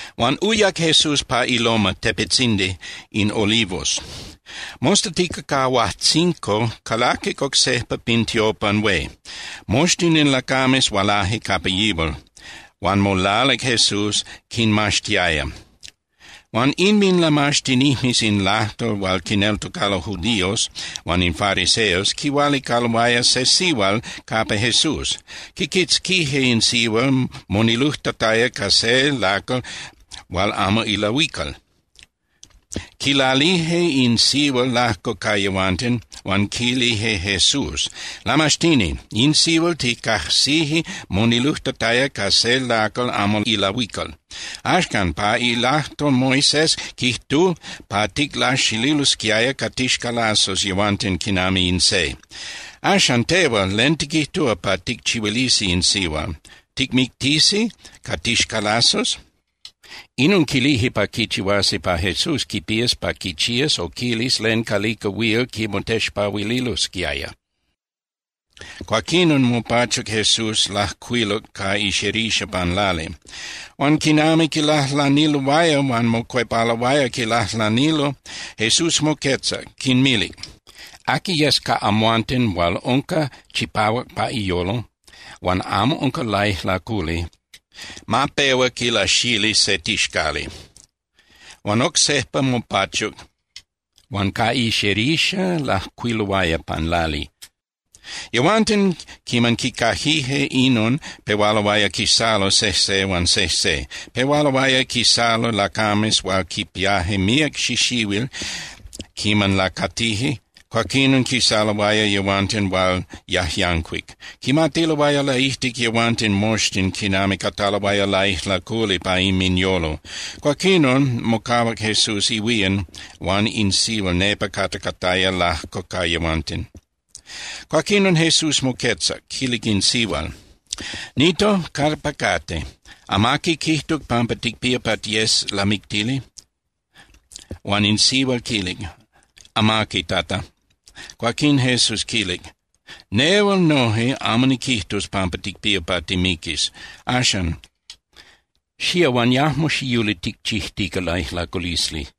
Huan uyac Jesús pa iLoma (tepetzindi) in Olivos. Mostatica ca huajtzinco, calaquic oc sejpa pin tiopan hué. Moxtin in lacames hualaje capa yihual, huan molalic Jesús, quinmaxtiaya. Huan inminlamaxtinijmes in lajtol hual quineltocalo judíos huan in fariseos quihualicaloaya se sihual capa Jesús. Quiquitzquije in sihual monilujtataya ca se lacal hual amo ilahuical. Quilalije in sihual lajco ca yehuanten, huan quilije Jesús: —Lamaxtini, in sihual ticajsije monilujtataya ca se lacal amo ilahuical. Axcan, pa ilajtol, Moisés quijtuc pa ticlaxililosquiaya ca tixcalazos yehuanten quinami in se. Axan, tehual ¿len tiquijtúa pa ticchihuilisi in sihual? ¿Ticmictisi ca tixcalazos? Inon quilije pa quichihuasi pa Jesús quipías pa quichías o quilis len calica huil quimotexpahuililosquiaya. Cuaquín mopachuc Jesús, lajcuiluc ca ixerixa pan lali. Huan quinami quilajlaniloaya huan mocuepaloaya quilajlanilo, Jesús moquetzac, quinmilic: —Aqui yes ca amhuanten hual unca chipahuac pa iyolo huan amo unca laijlaculi, ma pehua quilaxili se tixcali. Huan oc sejpa mopachuc, huan ca ixerixa lajcuiluaya pan lali. Yehuanten, quiman quicaquije inon, pehualoaya quisalo sejse huan sejse. Pehualoaya quisalo lacames hual quipiaje míac xixihuil quiman lacatije, cuaquinon quisaloaya yehuanten hual yajyancuic. Quimatiloaya laijtic yehuanten moxtin quinami cataloaya laijlaculi pa inminyolo. Cuaquinon, mocahuac Jesús ihuían huan in sihual nepa capa cataya lajco ca yehuanten. Cuaquinon Jesús moquetzac, quilic in sihual: —Nito, ¿capa cate? ¿Amaqui quijtuc pampa ticpía pa tiyes lamictili? Huan in sihual quilic: —Amaqui, Tata. Cuaquín Jesús quilic: —Nehual noje amo niquijtus pampa ticpía pa timiquis. Axan, xía huan yajmo xiyuli ticchijtica laijlaculisli.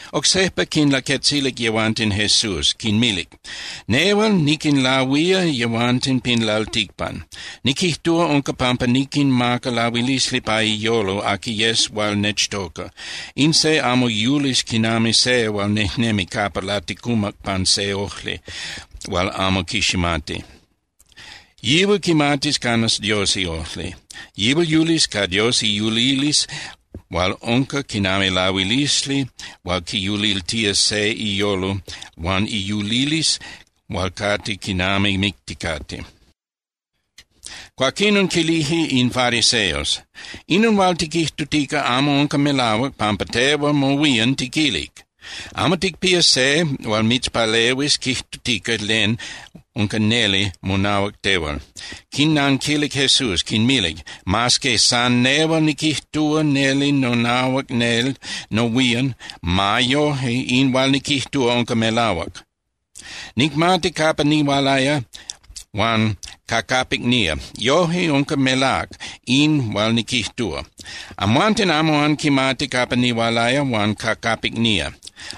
Oc sejpa quinlaquetzilic yehuanten Jesús, quinmilic: —Nehual niquinlahuía yehuanten pin lalticpan. Niquijtúa, unca pampa niquinmaca lahuilisli pa iyolo aqui yes hual nechtoca. In se amo yulis quinami se hual nejnemi capa laticumac pan se ojli hual amo quiximati. Yihual quimatis canas Dios iojli. Yihual yulis ca Dios iyulilisli hual unca quinami lahuilisli hual quiyuliltía se iyolo huan iyulilisli hual cate quinami micticate. Cuaquinon quilije in fariseos: —Inon hual tiquijtutica amo unca melahuac, pampa tehual mohuían tiquilic. Amo ticpía se hual mitzpalehuis quijtutica len unca neli monahuac tehual. Quinnanquilic Jesús, quinmilic: —Mas que san nehual niquijtúa neli nonahuac nel nohuían, ma yoje in hual niquijtúa unca melahuac. Nicmati capa nihualaya huan ca capic nía. Yoje, unca melác in hual niquijtúa. Amhuanten amo anquimati capa nihualaya huan ca capic nía.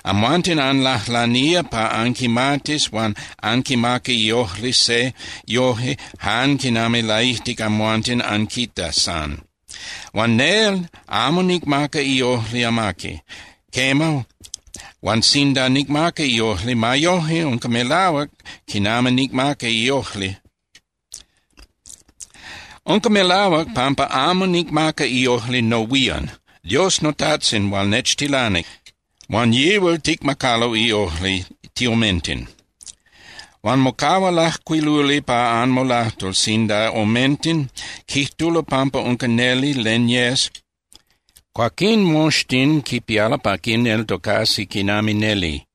Amhuanten anlajlanía pa anquimatis huan anquimaca iojli se yoje jan quinami laijtic amhuanten anquita san. Huan nel amo nicmaca iojli amaqui. Quema, huan sinda nicmaca iojli, ma yoje unca melahuac quinami nicmaca iojli. Unca melahuac pampa amo nicmaca iojli nohuían. Dios noTajtzin hual nechtilanic, huan yihual ticmacalo iojli tiomenten. Huan mocahua lajcuiluli pa anmolajtol sinda omenten quijtulo pampa unca neli len yes, cuaquín moxtin quipialo pa quineltocasi quinami neli.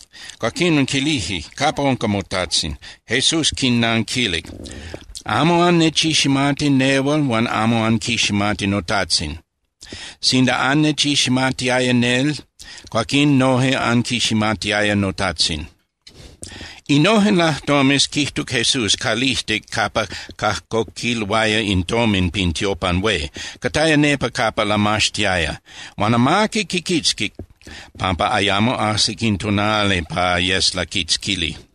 Cuaquinon quilije: —¿Capa unca moTajtzin? Jesús quinnanquilic: —Amo annechiximati nehual huan amo anquiximati noTajtzin. Sinda annechiximatiaya nel, cuaquín noje anquiximatiaya noTajtzin. Innojen lajtomes quijtuc Jesús calijtic capa cajcoquiloaya in tomin pin tiopan hué, cataya nepa capa lamaxtiaya. Huan amaqui quiquitzquic, pampa ayamo ajsic in tonali pa yes laquitzquili.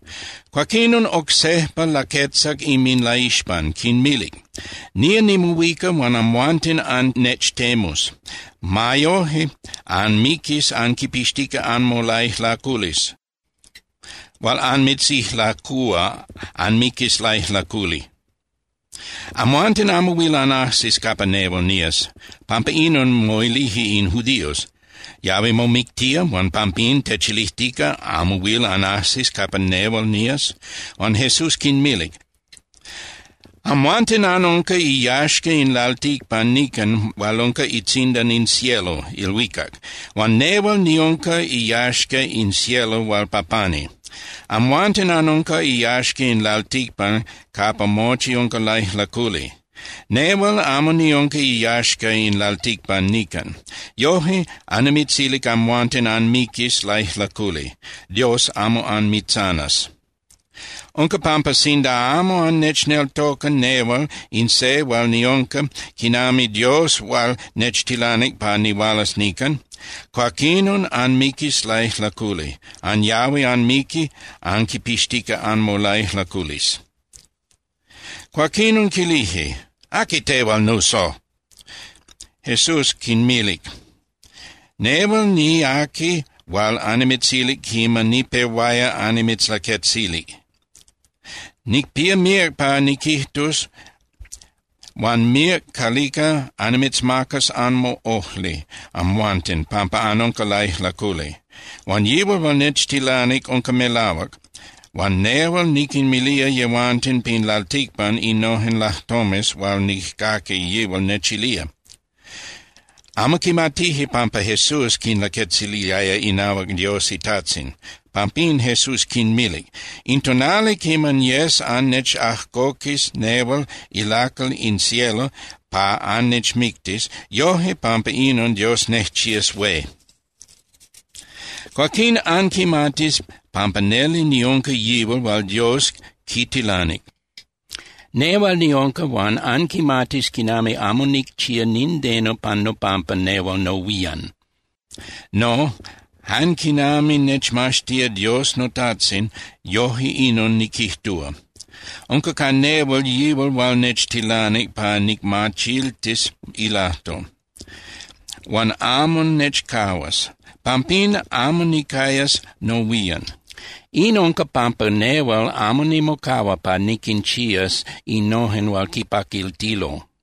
Cuaquinon oc sejpa laquetzac inminlaixpan, quinmilic: —Nía nimohuica huan amhuanten annechtemus. Ma yoje, anmiquis anquinpixtica anmolaijlaculisli hual anmitzijlacúa, anmiquis laijlaculi. Amhuanten amo huil anajsis capa nehual nías. Pampa inon, moilije in judíos: —¿Yahui momictía huan pampín techilijtica: “Amo huil anajsis capa nehual nías”? Huan Jesús quinmilic: —Amhuanten anunca iyaxca in lalticpan nican hual unca itzindan in cielo (ilhuicac). Huan nehual niunca iyaxca in cielo hual pa pani. Amhuanten anunca iyaxca in lalticpan capa mochi unca laijlaculi. Nehual amo niunca iyaxca in lalticpan nican. Yoje, annimitzilic amhuanten anmiquis laijlaculi, Dios amo anmitzanas. Unca pampa sinda amo annechneltoca nehual in se hual niunca quinami Dios hual nechtilanic pa nihualas nican, cuaquinon anmiquis laijlaculi, anyahui anmiqui anquipixtica anmolaijlaculisli. Cuaquinon quilije: —¿Aqui tehual, nuso? Jesús quinmilic: —Nehual niaqui hual annimitzilic quiman nipehuaya annimitzlaquetzili. Nicpía míac pa niquijtus huan míac calica annimitzmacas anmoꞌojli amhuanten pampa anunca laijlaculi. Huan yihual hual nechtilanic unca melahuac, huan nehual niquinmilía yehuanten pin lalticpan innojen lajtomes hual nijcaqui yihual nechilía. Amo quimatije pampa Jesús quinlaquetziliaya inahuac Dios iTajtzin. Pampín Jesús quinmilic: —In tonali quiman yes annechajcoquis nehual ilacal in cielo pa annechmictis, yoje pampa inon Dios nejchías hué. Cuaquín anquimatis pampa neli niunca yihual hual Dios quitilanic. Nehual niunca, huan anquimatis quinami amo nicchía nindeno pan nopampa nehual nohuían. No, jan quinami nechmaxtía Dios noTajtzin, yoje inon niquijtúa. Unca ca nehual yihual hual nechtilanic pa nicmachiltis ilajtol. Huan amo nechcahuas, pampín amo nicayas nohuían. In unca pampa nehual amo nimocahua pa niquinchías innojen hual quipaquiltilo.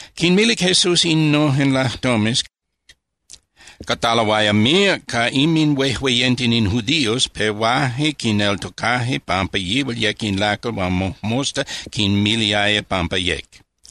Quinmilic Jesús innojen lajtomes, cataloaya míac ca inminhuejueyenten in judíos pehuaje quineltocaje pampa yihual yec in lacal hual mojmosta quinmiliaya pampa yec.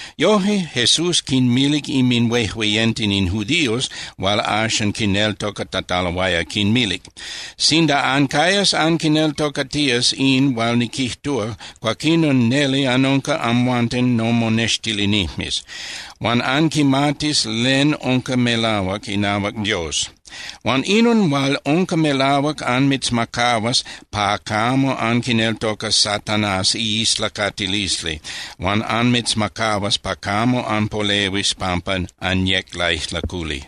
Yoje, Jesús quinmilic inminhuejueyenten in judíos hual axan quineltocatataloaya, quinmilic: —Sinda ancayas anquineltocatías in hual niquijtúa, cuaquinon neli anunca amhuanten nomonextilinijmes. Huan anquimatis len unca melahuac inahuac Dios. Huan inon hual unca melahuac anmitzmacahuas pa camo anquineltocas Satanás iislacatilisli huan anmitzmacahuas pa camo anpolehuis pampa anyec laijlaculi.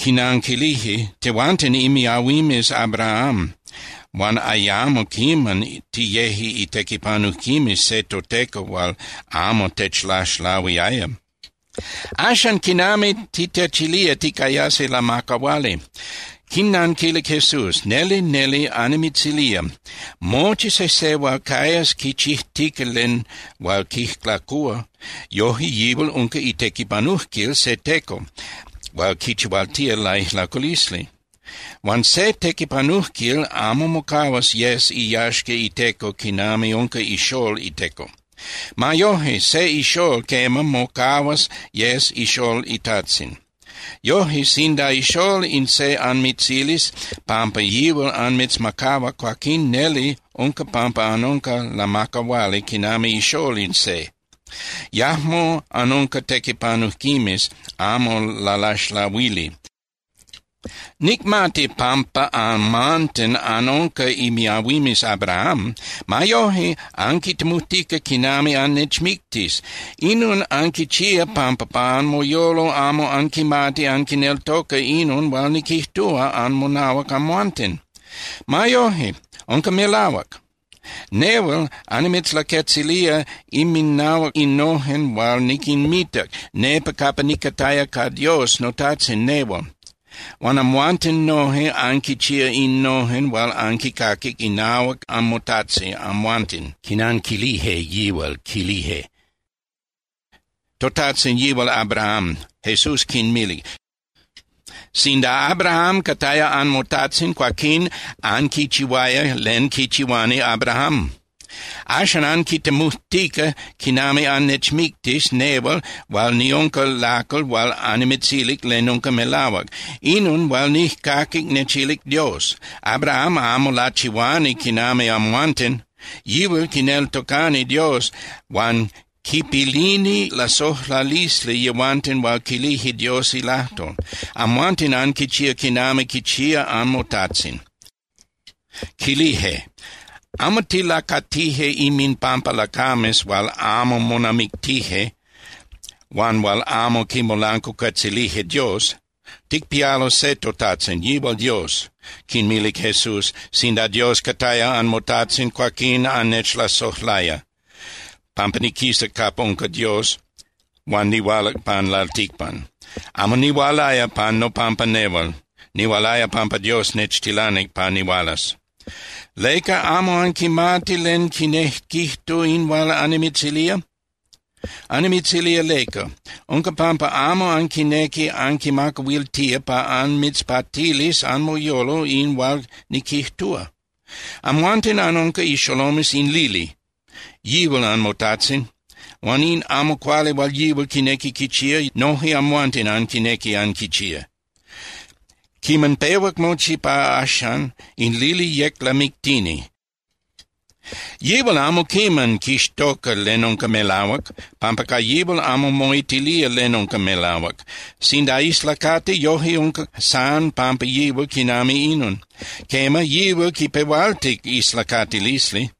Quinanquilije: —Tehuanten imiahuimes Abraham, huan ayamo quiman tiyeje itequipanujquimes se toteco hual amo techlaxlahuiaya. Axan, ¿quinami titechilía ticayasi lamacahuali? Quinnanquilic Jesús: —Neli, neli annimitzilía, mochi sejse hual cayas quichijtica len hual quijlacúa, yoje yihual unca itequipanujquil se teco hual quichihualtía laijlaculisli. Huan se tequipanujquil amo mocahuas yes iyaxca iteco quinami unca ixól iteco. Ma yoje, se ixól, quema, mocahuas yes ixól itajtzin. Yoje, sinda ixól in se anmitzilis pampa yihual anmitzmacahua, cuaquín neli unca pampa anunca lamacahuali quinami ixól in se. Yajmo anunca tequipanujquimes amo lalaxlahuili. Nicmati pampa amhuanten anunca imiahuimes Abraham. Ma yoje, anquitemujtica quinami annechmictis. Inon anquichía pampa pa anmoyolo amo anquinequi anquineltoca inon hual niquijtúa anmonahuac amhuanten. Ma yoje, unca melahuac. Nehual annimitzlaquetzilía inminahuac innojen hual niquinmitac nepa capa nicataya ca Dios noTajtzin nehual, huan amhuanten noje anquinchía innojen hual anquincaquic inahuac anmotajtzin amhuanten. Quinanquilije yihual, quilije: —Totajtzin yihual Abraham. Jesús quinmilic: —Sinda Abraham cataya anmotajtzin, cuaquín anquichihuaya len quichihuani Abraham. Axan anquitemujtica quinami annechmictis nehual hual niunca lacal hual annimitzilic len unca melahuac, inon hual nijcaquic nechilic Dios. Abraham amo lachihuani quinami amhuanten. Yihual quineltocani Dios huan quipilini lasojlalisli yehuanten hual quilije Dios ilajtol. Amhuanten anquichía quinami quichía anmotajtzin. Quilije: —Amo tilacatije inminpampa lacames hual amo monamictije huan hual amo quimolancuacuetzilije Dios. Ticpialo se toTajtzin, yihual Dios. Quinmilic Jesús: —Sinda Dios cataya anmoTajtzin, cuaquín annechlasojlaya, pampa niquisac capa unca Dios huan nihualac pan lalticpan. Amo nihualaya pan nopampa nehual, nihualaya pampa Dios nechtilanic pa nihualas. ¿Leca amo anquimati len quinejquijtu in hual annimitzilía? Annimitzilía leca. Unca pampa amo anquinequi anquimacahuiltía pa anmitzpatilis anmoyolo in hual niquijtúa. Amhuanten anunca ixolomes in lili, yihual anmotajtzin, huan in amo cuali hual yihual quinequi quichía, noje amhuanten anquinequi anquichía. Quiman pehuac mochi pa axan, in lili yec lamictini. Yihual amo quiman quixtoca len unca melahuac, pampa ca yihual amo moitilía len unca melahuac. Sinda islacati, yoje unca san pampa yihual quinami inon. Quema, yihual quipehualtic islacatilisli.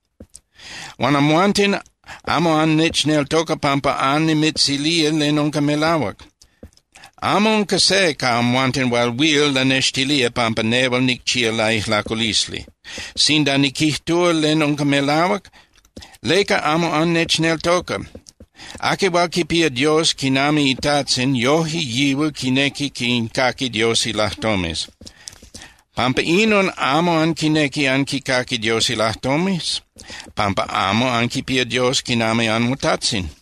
Huan amhuanten amo annechneltoca pampa annimitzilía len unca melahuac. Amo unca se ca amhuanten hual huil lanextilía pampa nel nicchía laijlaculisli. Sinda niquijtúa len unca melahuac, ¿leca amo annechneltoca? Aqui hual quipía Dios quinami iTajtzin, yoje yihual quinequi quincaqui Dios ilajtomes. Pampa inon amo anquinequi anquicaqui Dios ilajtomes, pampa amo anquipía Dios quinami anmoTajtzin.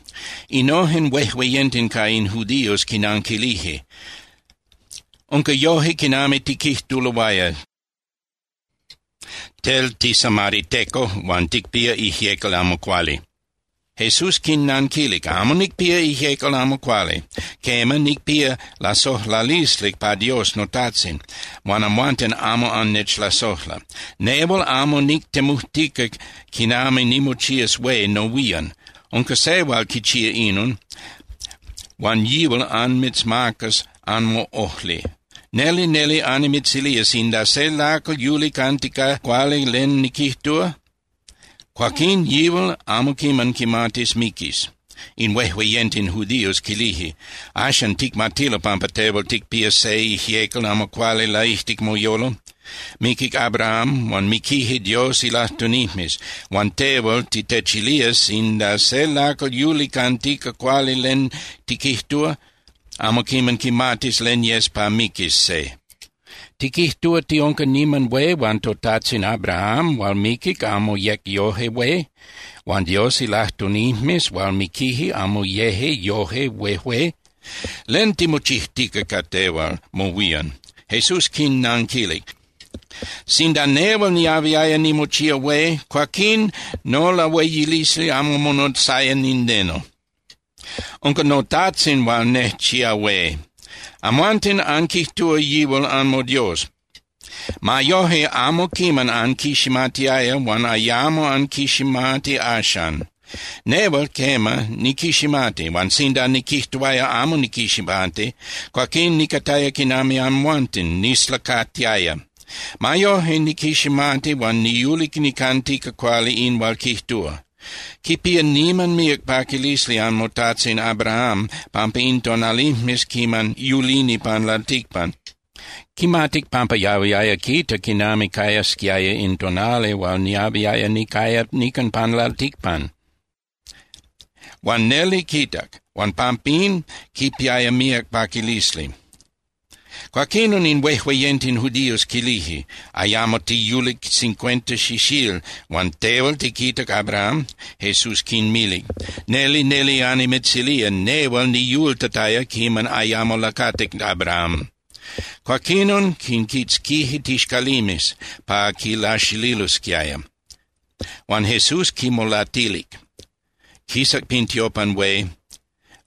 Innojen huejueyenten ca in judíos quinanquilije: —Unca yoje quinami tiquijtuloaya, tel tisamariteco huan ticpía ijyecal amo cuali. Jesús quinnanquilic: —Amo nicpía ijyecal amo cuali. Quema, nicpía lasojlalisli pa Dios noTajtzin, huan amhuanten amo annechlasojla. Nehual amo nictemujtica quinami nimochías hué nohuían. Unca Se hual quichía inon, huan yihual anmitzmacas anmoꞌojli. Neli, neli annimitzilía, sinda se lacal yuli cantica cuali len niquijtúa, cuaquín yihual amo quiman quimatis miquis. In huejueyenten judíos quilije: —Axan ticmatilo pampa tehual ticpía se ijyecal amo cuali laijtic moyolo. Miquic Abraham, huan miquije Dios ilajtunijmes, huan tehual titechilía sinda se lacal yuli cantica cuali len tiquijtúa, amo quiman quimatis len yes pa miquis se. ¿Tiquijtúa tiunca niman hué huan totajtzin Abraham hual miquic amo yec yoje hué? ¿Huan Dios ilajtunijmes hual miquije amo yeje yoje huejué? ¿Len timochijtica ca tehual mohuían? Jesús quinnanquilic: —Sinda nehual niahuiaya nimochía hué, cuaquín nolahueyilisli amo monotzaya nindeno. Unca noTajtzin hual nejchía hué. Amhuanten anquijtúa yihual anmoDios. Ma yoje, amo quiman anquiximatiaya huan ayamo anquiximati axan. Nehual, quema, niquiximati. Huan sinda niquijtuaya: “Amo niquiximati”, cuaquín nicataya quinami amhuanten, nislacatiaya. Ma yoje, niquiximati huan niyuli nicantica cuali in hual quijtúa. Quipiaya niman míac paquilisli anmotajtzin Abraham, pampa in tonalijmes quiman yulini pan lalticpan, quimatic pampa yahuiaya quita quinami cayasquiaya in tonali hual niahuiaya nicaya nican pan lalticpan. Huan neli quitac, huan pampín quipiaya míac paquilisli. Cuaquinon in huejueyenten judíos quilije: —Ayamo tiyulic cincuenta xixíl huan ¿tehual tiquitac Abraham? Jesús quinmilic: —Neli, neli annimitzilía, nehual niyultataya quiman ayamo lacatic Abraham. Cuaquinon quinquitzquije tixcalimes pa quilaxililosquiaya, huan Jesús quinmolatilic, quisac pin tiopan hué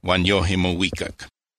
huan yoje mohuicac